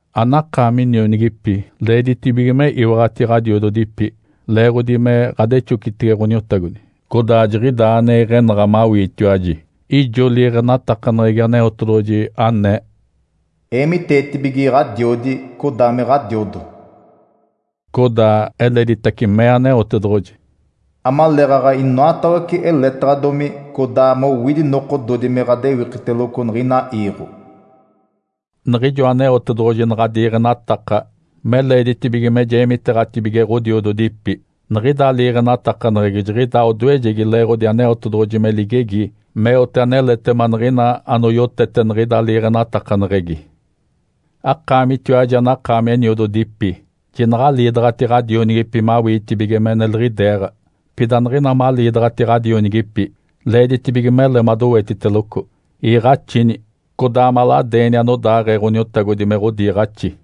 Anakaami nionigipi, leeditibige me iwaɡ̶ati ɡ̶adiododipi, leeɡ̶odi me ɡ̶adexocitege Ǥoniotagodi. Codaa jiɡ̶idaa ane iɡ̶enaɡ̶a mawiitiwaji. Ijo liiɡ̶enatakaneɡ̶egi Aneotedoɡ̶oji anee, “Eemiteetibige ɡ̶adiodi, codaa me ɡ̶adiodo.” Codaa eleditace mee Aneotedoɡ̶oji, “Amaleeɡ̶aɡ̶a inoatawece eletaɡ̶adomi, codaa mowidi nokododi me ɡ̶adewikiteloco niɡ̶ina iiɡ̶o.” Niɡ̶ijo Aneotedoɡ̶oji naɡ̶a diiɡ̶enataka me leeditibige me jeemiteeɡ̶atibige ɡ̶odiododipi, niɡ̶ida liiɡ̶enatakaneɡ̶egi jiɡ̶idaa odoejegi leeɡ̶odi Aneotedoɡ̶oji me ligegi meote aneletema niɡ̶ina anoyotete niɡ̶ida liiɡ̶enatakaneɡ̶egi. Akaamitiwaji anakaami eniododipi, jinaɡ̶aliidaɡ̶ati ɡ̶adionigipi mawiitibige me neliɡ̶ideeɡ̶a. Pida niɡ̶ina maliidaɡ̶ati ɡ̶adionigipi, leeditibige mele madowetiteloco, iiɡ̶axini, codaa maladeeni anodaaɡ̶ee Ǥoniotagodi me ɡ̶odiiɡ̶axi.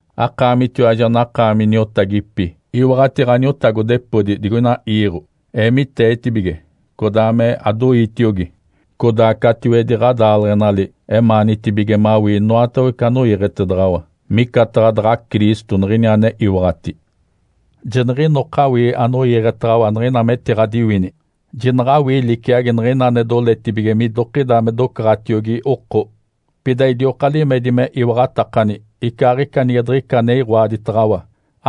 Akaamitiwaji anakaami niotagipi, iwaɡ̶ati ɡ̶aniotagodepodi digoina iiɡ̶o. Eemiteetibige codaa me adoiitiogi, codaa catiwedi ɡ̶adaaleɡ̶enali emaanitibige mawii inoatawece anoiiɡ̶etedaɡ̶awa, micataɡ̶a daɡ̶a Cristo niɡ̶ini ane iwaɡ̶ati. Jiniɡ̶inoka awii anoiiɡ̶etaɡ̶awa niɡ̶ina metiɡ̶adiwini, jinaɡ̶awii liciagi niɡ̶ina ane doletibige midokida me docaɡ̶atiogi oko. Pida idioka limedi me iwaɡ̶atakani, icaaɡ̶ica nige diɡ̶ica ane iɡ̶oaditaɡ̶awa,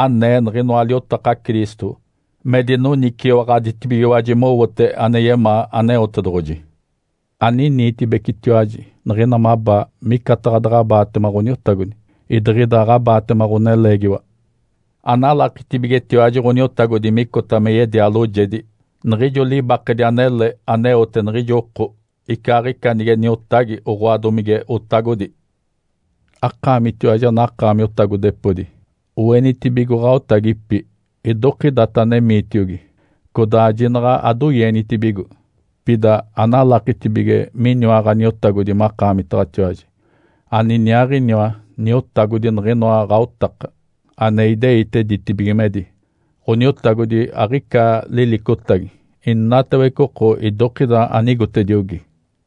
anee niɡ̶inoa liotaka Cristo, me dinoniciwaɡ̶aditibigiwaji mowote ane yemaa Aneotedoɡ̶oji. Aniniitibecitiwaji niɡ̶ina mabaa micataɡ̶a daɡ̶abaatema Ǥoniotagodi, idiɡ̶ida aɡ̶abaatema ɡ̶oneleegiwa. Analakitibigetiwaji Ǥoniotagodi micota me yedia loojedi niɡ̶ijo libakedi anele aneote niɡ̶ijo oko, icaaɡ̶ica nige niotagi, oɡ̶oa domige otagodi. Akaamitiwaji anakaami otagodepodi, oenitibigo ɡ̶aotagipi idokidata anemiitiogi, codaa jinaɡ̶a adoienitibigo. Pida analakitibige miniwa Ǥaniotagodi makaamitaɡ̶atiwaji, aniniaaɡ̶iniwa Niotagodi niɡ̶inoa ɡ̶aotaka, ane ideite ditibigimedi. Ǥoniotagodi aɡ̶ica lilicotagi, inatawece oko idokida anigotediogi.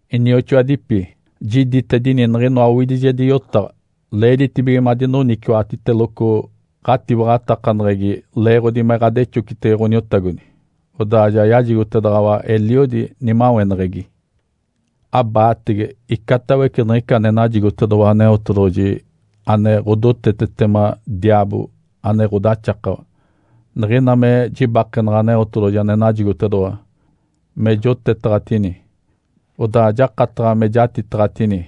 Inioxoadipi, jiditedini niɡ̶inoa owidijedi yotaɡ̶a. Leeditibige madinoniciwaɡ̶atiteloco ɡ̶atiwaɡ̶atakaneɡ̶egi leeɡ̶odi me ɡ̶adexocitege Ǥoniotagodi, odaa ja yajigotedaɡ̶awa eliodi nimaweneɡ̶egi. Abaatege icatawece niɡ̶ica ane najigotedoɡ̶owa Aneotedoɡ̶oji ane ɡ̶odotetetema diaabo ane ɡ̶odaxakawa. Niɡ̶ina me jibakenaɡ̶a Aneotedoɡ̶oji ane najigotedoɡ̶owa me jotetaɡ̶atini, odaa jakataɡ̶a me jatitaɡ̶atini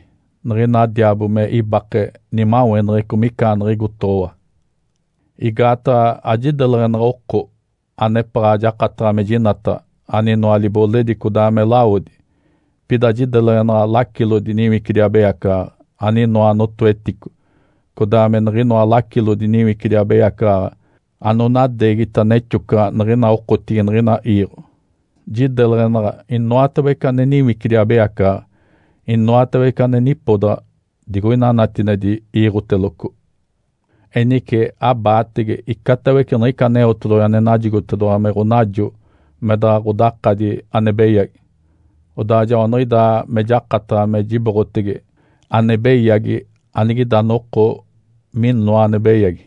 niɡ̶ina diaabo me ibake nimaweneɡ̶eco micaaniɡ̶igotoɡ̶owa. Igaataɡ̶a ajideleɡ̶enaɡ̶a oko anepaɡ̶a jakataɡ̶a me jinataɡ̶a, aninoa libole codaa me lawodi. Pida jideleɡ̶enaɡ̶a lacilodi niwicidi abeyacaɡ̶aɡ̶a, aninoa notoetico, codaa me niɡ̶inoa lacilodi niwicidi abeyacaɡ̶aɡ̶a anonadeegita nexocaɡ̶a niɡ̶ina okotigi niɡ̶ina iiɡ̶o. Jideleɡ̶enaɡ̶a inoatawece ane niwicidi abeyacaɡ̶aɡ̶a inoatawece ane nipodaɡ̶a digoina natinedi iiɡ̶oteloco. Enice, abaatege icatawece niɡ̶ica Aneotedoɡ̶oji ane najigotedoɡ̶owa me ɡ̶onajo me daɡ̶a ɡ̶odakadi ane beyagi. Odaa joaniɡ̶idaa me jakataɡ̶a me jiboɡ̶atege ane beyagi anigida noko minoa ane beyagi,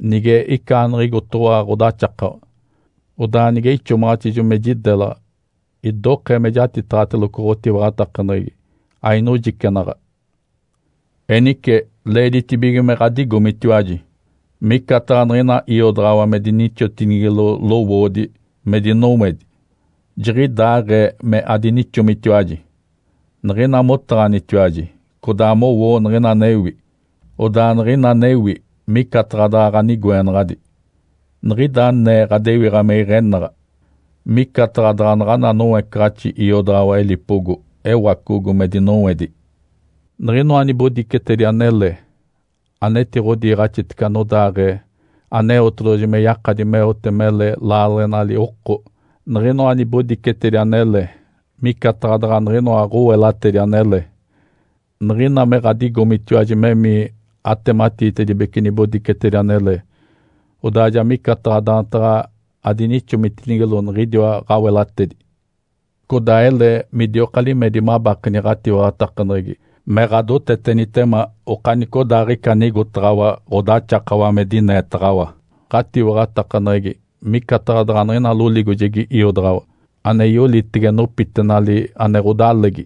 nige icaaniɡ̶igotoɡ̶owa ɡ̶odaxakawa. Odaa nige ixomaɡ̶atijo me jidelaɡ̶a, idokee me jatitaɡ̶ateloco ɡ̶otiwaɡ̶atakaneɡ̶egi, ainojicenaɡ̶a. Enice, leeditibige me ɡ̶adigomitiwaji. Micataɡ̶a niɡ̶ina iodaɡ̶awa me dinixotinigilo lowoodi me dinowedi, jiɡ̶idaaɡ̶ee me adinixomitiwaji. Niɡ̶ina motaɡ̶anitiwaji codaa mowoo niɡ̶ina anewi, odaa niɡ̶ina anewi micataɡ̶a daɡ̶a ɡ̶anigoenaɡ̶adi. Niɡ̶ida anee ɡ̶adewiɡ̶a me iɡ̶enaɡ̶a, micataɡ̶a daɡ̶a naɡ̶ana noecaɡ̶axi iodaɡ̶awa elipogo ewacogo me dinowedi. Niɡ̶inoa nibodicetedi anele anetiɡ̶odiiɡ̶axitece anodaaɡ̶ee Aneotedoɡ̶oji me yakadi meote mele laaleɡ̶enali oko, niɡ̶inoa nibodicetedi anele micataɡ̶a daɡ̶a niɡ̶inoa ɡ̶awelatedi anele. Niɡ̶ina me ɡ̶adigomitiwaji memii atematiitedibece nibodicetedi anele, odaa ja micataɡ̶a daantaɡ̶a adinixomitinigilo niɡ̶idiwa ɡ̶awelatedi. Codaa ele midioka limedi mabakeni ɡ̶atiwaɡ̶atakaneɡ̶egi me ɡ̶adotetenitema okanicodaaɡ̶ica anigotaɡ̶awa ɡ̶odaxakawa me dineetaɡ̶awa. Ǥatiwaɡ̶atakaneɡ̶egi micataɡ̶a daɡ̶a niɡ̶ina loligojegi iodaɡ̶awa, ane yolitege nopitenali ane ɡ̶odalegi.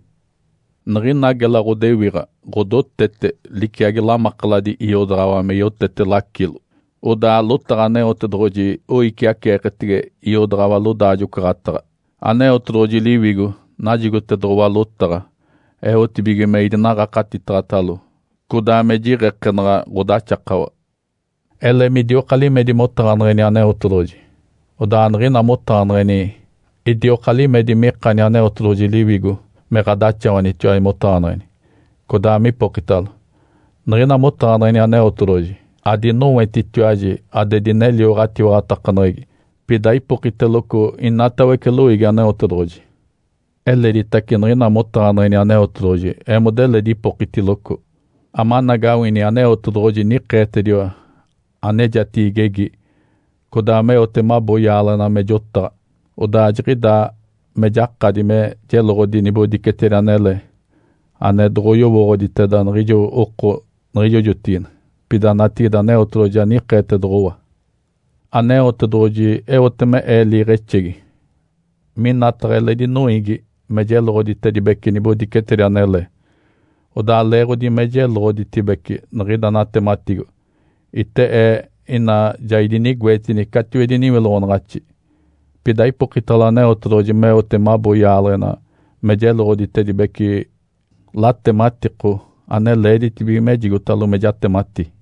Niɡ̶ina gela ɡ̶odewiɡ̶a ɡ̶odotete liciagi lamakaladi iodaɡ̶awa me yotete lacilo. Odaa lotaɡ̶a Aneotedoɡ̶oji oiciaceeketege iodaɡ̶awa lodaajo-ocaɡ̶ataɡ̶a. Aneotedoɡ̶oji Liwigo najigotedoɡ̶owa lotaɡ̶a eotibige me idinaɡ̶akatitaɡ̶atalo, codaa me jiɡ̶ekenaɡ̶a ɡ̶odaxakawa. Ele midioka limedi motaɡ̶aneɡ̶eni Aneotedoɡ̶oji, odaa niɡ̶ina motaɡ̶aneɡ̶eni, idioka limedi mikani Aneotedoɡ̶oji Liwigo me ɡ̶adaxawanitiwaji motaɡ̶aneɡ̶eni, codaa mipokitalo. Niɡ̶ina motaɡ̶aneɡ̶eni Aneotedoɡ̶oji, adinowetitiwaji ade dinelio ɡ̶atiwaɡ̶atakaneɡ̶egi, pida ipokiteloco inatawece loiigi Aneotedoɡ̶oji. Eleditace niɡ̶ina motaɡ̶aneɡ̶eni Aneotedoɡ̶oji, eemodeledi ipokitiloco, amanagawini Aneotedoɡ̶oji nikeetediwa anejatigi igegi, codaa meote mabo yaaleɡ̶ena me jotaɡ̶a. Odaa jiɡ̶idaa me jakadi me jeloɡ̶odi nibodicetedi anele ane doɡ̶oyowooɡ̶oditeda niɡ̶ijo oko niɡ̶ijo jotigide, pida natigide Aneotedoɡ̶oji ja nikeetedoɡ̶owa. Aneotedoɡ̶oji eote me ee liiɡ̶exegi minataɡ̶a eledi noiigi me jeloɡ̶oditedibece nibodicetedi anele, odaa leeɡ̶odi me jeloɡ̶oditibece niɡ̶ida natematigo, ite ee ina ja idinigoetini catiwedi niwiloɡ̶onaɡ̶axi. Pida ipokitalo Aneotedoɡ̶oji meote mabo yaaleɡ̶ena me jeloɡ̶oditedibece latematiko ane leeditibige mejigotalo me jatemati.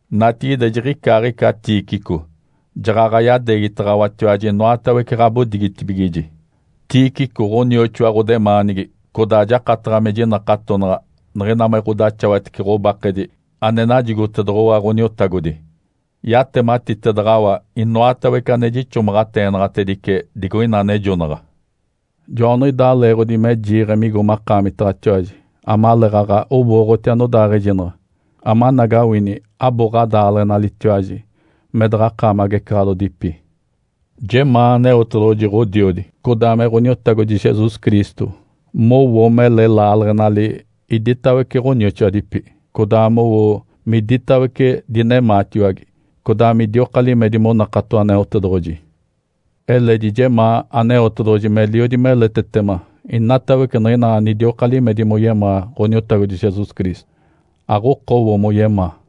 Natigide, jiɡ̶icaaɡ̶ica Tíquico jaɡ̶aɡ̶a yadeegitaɡ̶awatiwaji inoatawece ɡ̶abodigitibigiji. Tíquico ɡ̶onioxoa ɡ̶odemaanigi, codaa jakataɡ̶a me jinakatonaɡ̶a niɡ̶ina me ɡ̶odaxawatece ɡ̶obakedi ane najigotedoɡ̶owa Ǥoniotagodi. Yatematitedaɡ̶awa inoatawece ane jixomaɡ̶ateenaɡ̶atedice digoina anejonaɡ̶a. Joaniɡ̶idaa leeɡ̶odi me jiiɡ̶e migo makaamitaɡ̶atiwaji, amaleeɡ̶aɡ̶a owooɡ̶oti anodaaɡ̶ejinaɡ̶a, amanagawini abo ɡ̶adaaleɡ̶enalitiwaji, me daɡ̶a akaami agecaɡ̶alodipi. Jemaa Aneotedoɡ̶oji, Ǥodiodi, codaa me Ǥoniotagodi Jesus Cristo mowo mele laaleɡ̶enali iditawece ɡ̶onioxoadipi, codaa mowo miditawece dinemaatiwage, codaa midioka limedi monakato Aneotedoɡ̶oji. Eledi jemaa Aneotedoɡ̶oji meliodi meletetema inatawece niɡ̶ina anidioka limedi moyemaa Ǥoniotagodi Jesus Cristo, aɡ̶okowo moyemaa.